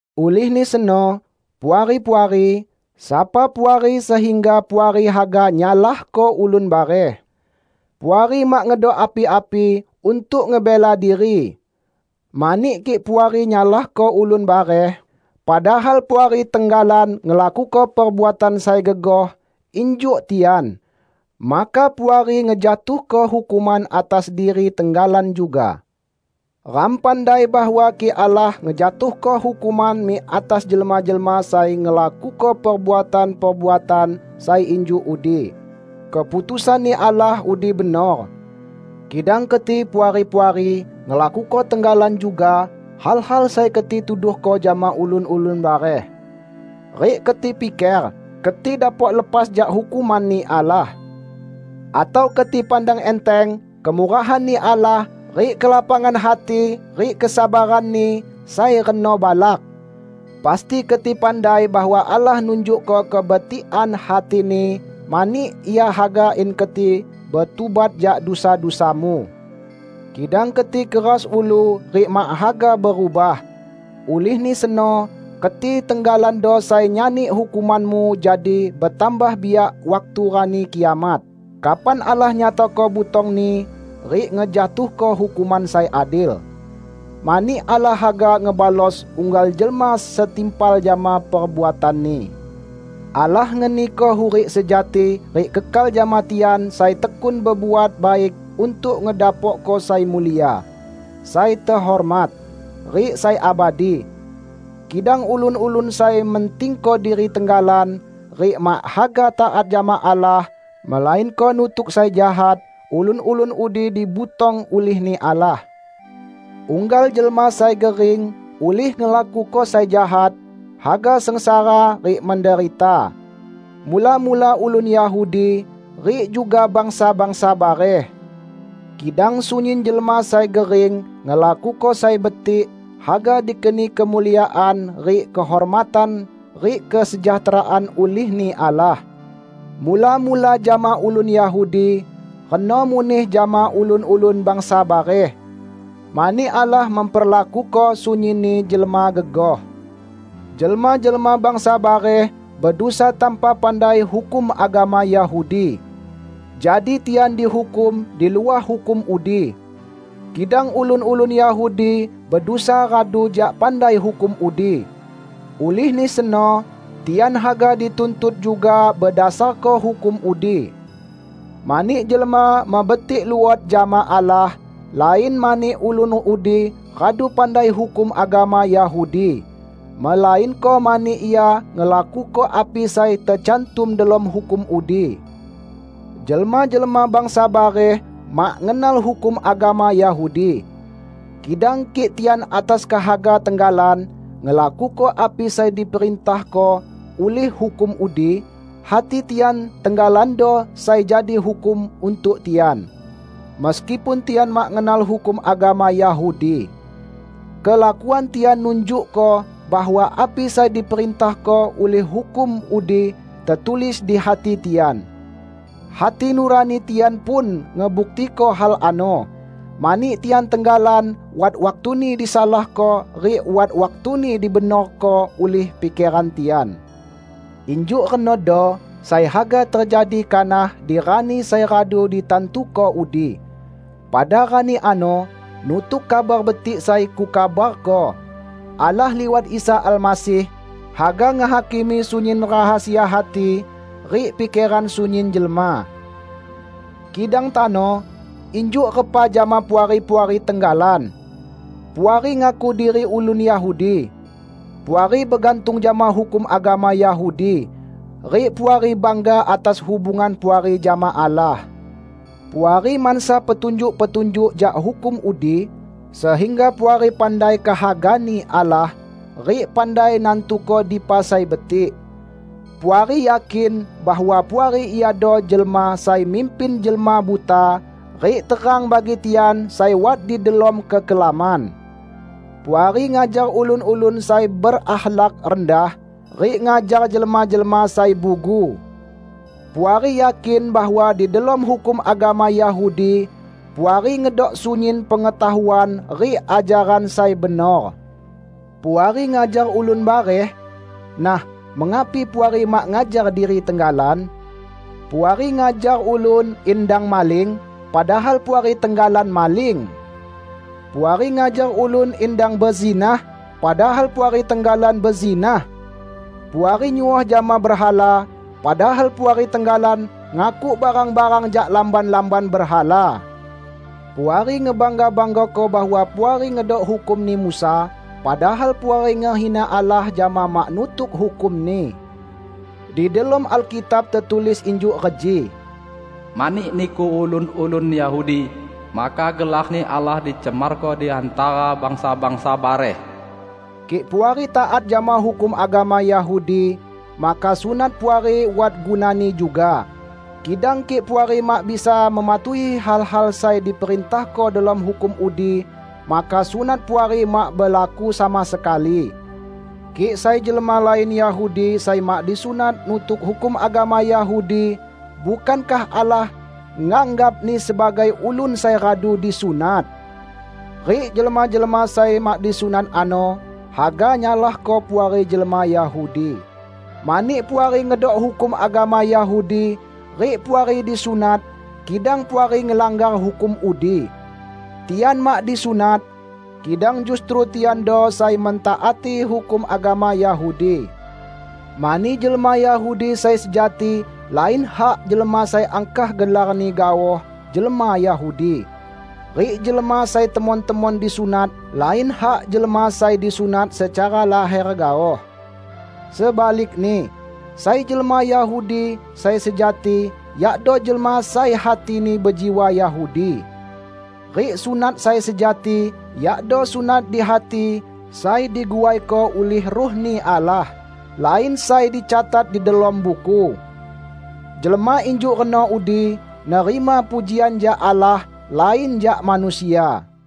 Ulihni seno, Puari-puari, sapa Puari sehingga Puari haga nyalahko ulun bareh? Puari mak ngedok api-api untuk ngebela diri! Mani kik Puari nyalahko ulun bareh, padahal Puari tenggalan ngelakuko perbuatan sai gegoh injuk tian, maka Puari ngejatuhko hukuman atas diri tenggalan juga. Ram pandai bahwa kik Allah ngejatuhko hukuman mik atas jelma-jelma sai ngelakuko perbuatan-perbuatan sai injuk udi, keputusan-Ni Allah udi benor. Kidang keti, Puari-puari, ngelakuko tenggalan juga hal-hal sai keti tuduhko jama ulun-ulun bareh! Rik keti piker keti dapok lepas jak hukuman-Ni Allah? Atau keti pandang enteng kemurahan-Ni Allah rik kelapangan hati rik kesabaran-Ni sai reno balak! Pasti keti pandai bahwa Allah nunjukko kebetikan hati-Ni mani Ia haga in keti betubat jak dusa-dusamu. Kidang keti keras ulu rik mak haga berubah. Ulihni seno keti tenggalando sai nyani hukumanmu jadi betambah biak waktu Rani Kiamat, kapan Allah nyatako butong-Ni rik ngejatuhko hukuman sai adil. Mani Allah haga ngebalos unggal jelma setimpal jama perbuatanni. Allah ngeniko hurik sejati rik kekal jama tian sai tekun bebuat baik untuk ngedapokko sai mulia, sai tehormat, rik sai abadi. Kidang ulun-ulun sai mentingko diri tenggalan rik mak haga taat jama Allah, melainko nutuk sai jahat, ulun-ulun udi dibutong ulih-Ni Allah. Unggal jelma sai gering ulih ngelakuko sai jahat haga sengsara rik menderita; mula-mula ulun Yahudi, rik juga bangsa-bangsa bareh. Kidang sunyin jelma sai gering ngelakuko sai betik haga dikeni kemuliaan rik kehormatan rik kesejahteraan ulih-Ni Allah; mula-mula jama ulun Yahudi, reno muneh jama ulun-ulun bangsa bareh. Mani Allah memperlakuko sunyinni jelma gegoh. Jelma-jelma bangsa bareh bedusa tanpa pandai hukum agama Yahudi. Jadi tian dihukum di luah hukum udi. Kidang ulun-ulun Yahudi bedusa radu jak pandai hukum udi; ulihni seno tian haga dituntut juga bedasarko hukum udi. Mani jelma mebetik luot jama Allah, lain mani ulun udi radu pandai hukum agama Yahudi, melainko mani ia ngelakuko api sai tecantum delom hukum udi. Jelma-jelma bangsa bareh mak ngenal hukum agama Yahudi. Kidang kik tian atas kehaga tenggalan ngelakuko api sai diperintahko ulih hukum udi, hati tian tenggalando sai jadi hukum untuk tian, meskipun tian mak ngenal hukum agama Yahudi. Kelakuan tian nunjukko bahwa api sai diperintahko ulih hukum udi tetulis di hati tian. Hati nurani tian pun ngebuktiko hal ano, mani tian tenggalan wat waktuni disalahko rik wat waktuni dibenorko ulih pikeran tian. Injuk renodo sai haga tejadi kanah di rani sai radu ditantuko udi. Pada rani ano -- nutuk Kabar Betik sai kukabarko -- Allah liwat Isa Almasih, haga ngehakimi sunyin rahasia hati rik pikeran sunyin jelma. Kidang tano injuk repa jama Puari-puari tenggalan? Puari ngaku diri ulun Yahudi. Puari begantung jama hukum agama Yahudi rik Puari bangga atas hubungan Puari jama Allah. Puari mansa petunjuk-petunjuk jak hukum udi, sehingga Puari pandai kehaga-Ni Allah rik pandai nantuko dipa sai betik. Puari yakin bahwa Puari iado jelma sai mimpin jelma buta rik terang bagi tian sai wat di delom kekelaman; Puari ngajar ulun-ulun sai berakhlak rendah, rik ngajar jelma-jelma sai bugu. Puari yakin bahwa di delom hukum agama Yahudi, Puari ngedok sunyin pengetahuan rik ajaran sai benor. Puari ngajar ulun bareh; nah, mengapi Puari mak ngajar diri tenggalan? Puari ngajar ulun in dang maling, padahal Puari tenggalan maling! Puari ngajar ulun in dang bezinah, padahal Puari tenggalan bezinah! Puari nyuoh jama berhala, padahal Puari tenggalan ngakuk barang-barang jak lamban-lamban berhala. Puari ngebangga-banggako bahwa Puari ngedok hukumni Musa, padahal Puari ngehina Allah jama mak nutuk hukum-Ni. Di delom Alkitab tetulis injuk reji, "Mani niku, ulun-ulun Yahudi, maka gelar-Ni Allah dicemarko di hantara bangsa-bangsa bareh." Kik Puari taat jama hukum agama Yahudi, maka sunat Puari wat gunani juga. Kidang kik Puari mak bisa mematuhi hal-hal sai diperintahko delom hukum udi, maka sunat Puari mak belaku sama sekali. Kik sai jelma lain Yahudi sai mak disunat, nutuk hukum agama Yahudi, bukankah Allah nganggapni sebagai ulun sai radu disunat? Rik jelma-jelma sai mak disunat ano haga nyalahko Puari jelma Yahudi, mani Puari ngedok hukum agama Yahudi rik Puari disunat, kidang Puari ngelanggar hukum udi. Tian mak disunat, kidang justru tiando sai mentaati hukum agama Yahudi. Mani jelma Yahudi sai sejati lain hak jelma sai angkah gelarni gaoh jelma Yahudi; rik jelma sai temon-temon disunat lain hak jelma sai disunat secara laher gaoh. Sebalikni, sai jelma Yahudi sai sejati yakdo jelma sai hatini bejiwa Yahudi; rik sunat sai sejati yakdo sunat di hati sai diguaiko ulih Ruh-Ni Allah, lain sai dicatat di delom buku. Jelma injuk reno udi nerima pujian jak Allah, lain jak manusia.